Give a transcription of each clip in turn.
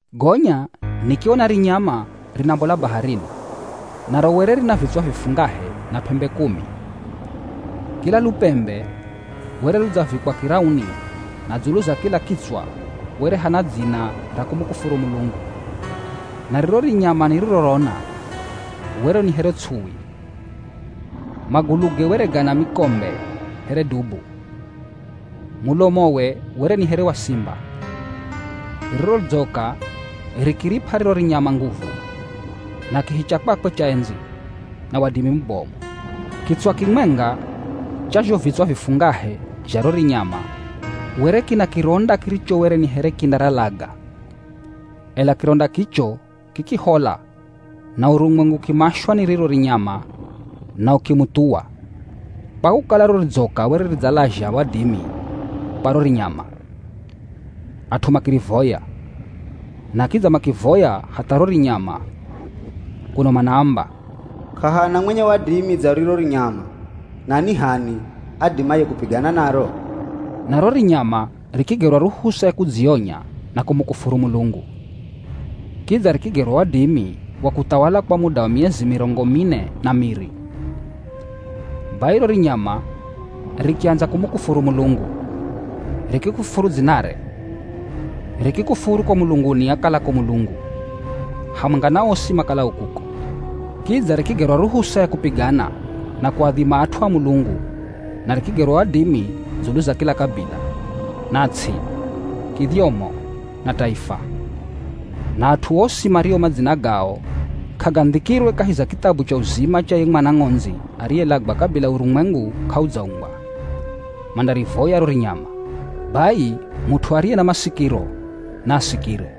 Gonya nikiona rinyama rinambola baharini. Naro were rina vitswa vifungahe na p'embe kumi. Kila lupembe were ludzavikwa kirauni na dzulu za kila kitswa were hana dzina ra kumukufuru Mulungu. Na riro rinyama nirirorona were ni here ts'uwi. Maguluge were gana mikombe here dubu. Mulomowe were ni here wa simba. Riro ridzoka rikirip'a riro rinyama nguvu, na kihi cha kwakwe cha endzi, na wadimi mubomu. Kitswa kimwenga cha zho vitswa vifungahe zha ro rinyama were kina kironda kiricho were ni here kindaralaga, ela kironda kicho kikihola na urumwengu ukimashwa ni riro rinyama na ukimuthuwa. Kwa kukala ro ridzoka were ridzalazha wadimi kwa ro rinyama, at'u makirivoya, na kidza makivoya hatha ro rinyama, kuno manaamba, “K'ahana mwenye wadimi dza riro rinyama na ni h'ani adimaye kupigana naro?” Na ro rinyama rikigerwa ruhusa ya kudzionya na kumukufuru Mulungu, kidza rikigerwa wadimi wa kuthawala kwa muda wa miezi mirongo mine na miri. Bai ro rinyama rikiandza kumukufuru Mulungu, rikikufuru dzinare, rikikufuru ko mulunguni akalako Mulungu, hamwenga na osi makalao kuko. Kidza rikigerwa ruhusa ya kupigana, na kuadhima at'u a Mulungu na rikigerwa wadimi dzulu za kila kabila, na ts'i, kidhyomo, na taifa. Na at'u osi mario madzina gao k'agandhikirwe kahi za kithabu cha uzima cha ye Mwana Ng'ondzi ariyelagwa kabila urumwengu k'audzaumbwa, mandarivoya ro rinyama. Bai mut'u ariye na masikiro naasikire.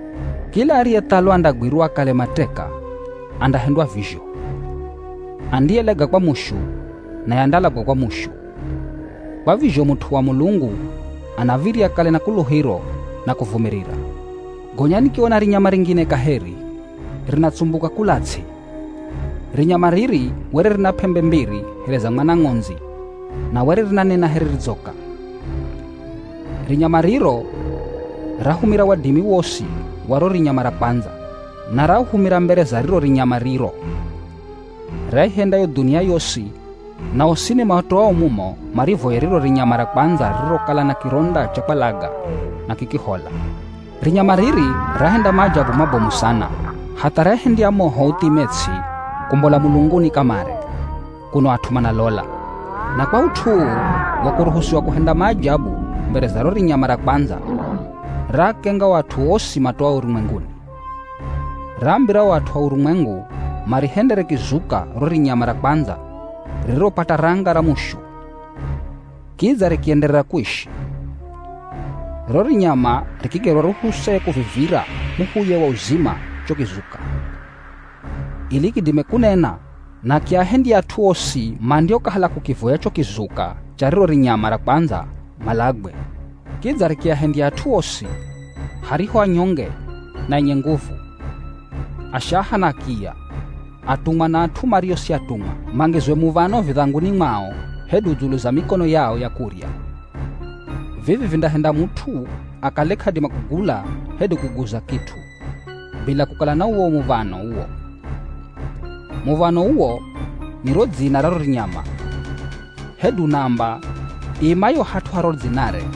Kila ariyethalwa andagwirwa akale mateka, andahendwa vizho. Andiyelaga kwa mushu, naye andalagwa kwa mushu. Kwa vizho mut'u wa Mulungu anav̱irya akale na kuluhiro na kuvumirira. Gonya nikiona rinyama ringine kaheri rinatsumbuka kula ts'i. Rinyama riri were rina p'embe mbiri here za mwana ng'ondzi na were rinanena here ridzoka. Rinyama riro rahumira wadimi wosi wa ro rinyama ra kwandza. Na rauhumira mbere za riro rinyama riro. Raihendya yo dhunia yosi na osini matoao mumo marivoye riro rinyama ra kwandza ririrokala na kironda cha kwalaga na kikihola. Rinyama riri rahenda maajabu mabomu sana, hatha rahendya moho uthime ts'i kumbola mulunguni kamare kuno at'u manalola. Na kwa ut'u uu wa kuruhusiwa kuhenda maajabu mbere za ro rinyama ra kwandza, raakenga o at'u osi matoao urumwenguni. Raambira o at'u a urumwengu marihendere kizuka ro rinyama ra kwandza ririropata ranga ra mushu kidza rikienderera kuishi. Ro rinyama rikigerwa ruhusa ya kukivivira muhuye wa uzima cho kizuka, ili kidime kunena na kiahendye at'u osi mandiokahala kukivoya cho kizuka cha riro rinyama ra kwandza malagwe. Kidza rikiahendya at'u osi, hariho anyonge na enye nguvu, ashaha na akiya, atumwa na at'u mario si atumwa, mangizwe muv̱ano vidhanguni mwao hedu dzulu za mikono yao ya kurya. Vivi vindahenda mut'u akale k'adima kugula hedu kuguza kit'u bila kukala na uwo muv̱ano uwo. Muv̱ano uwo ni ro dzina ra ro rinyama, hedu namba iimayo hat'u ha ro dzinare.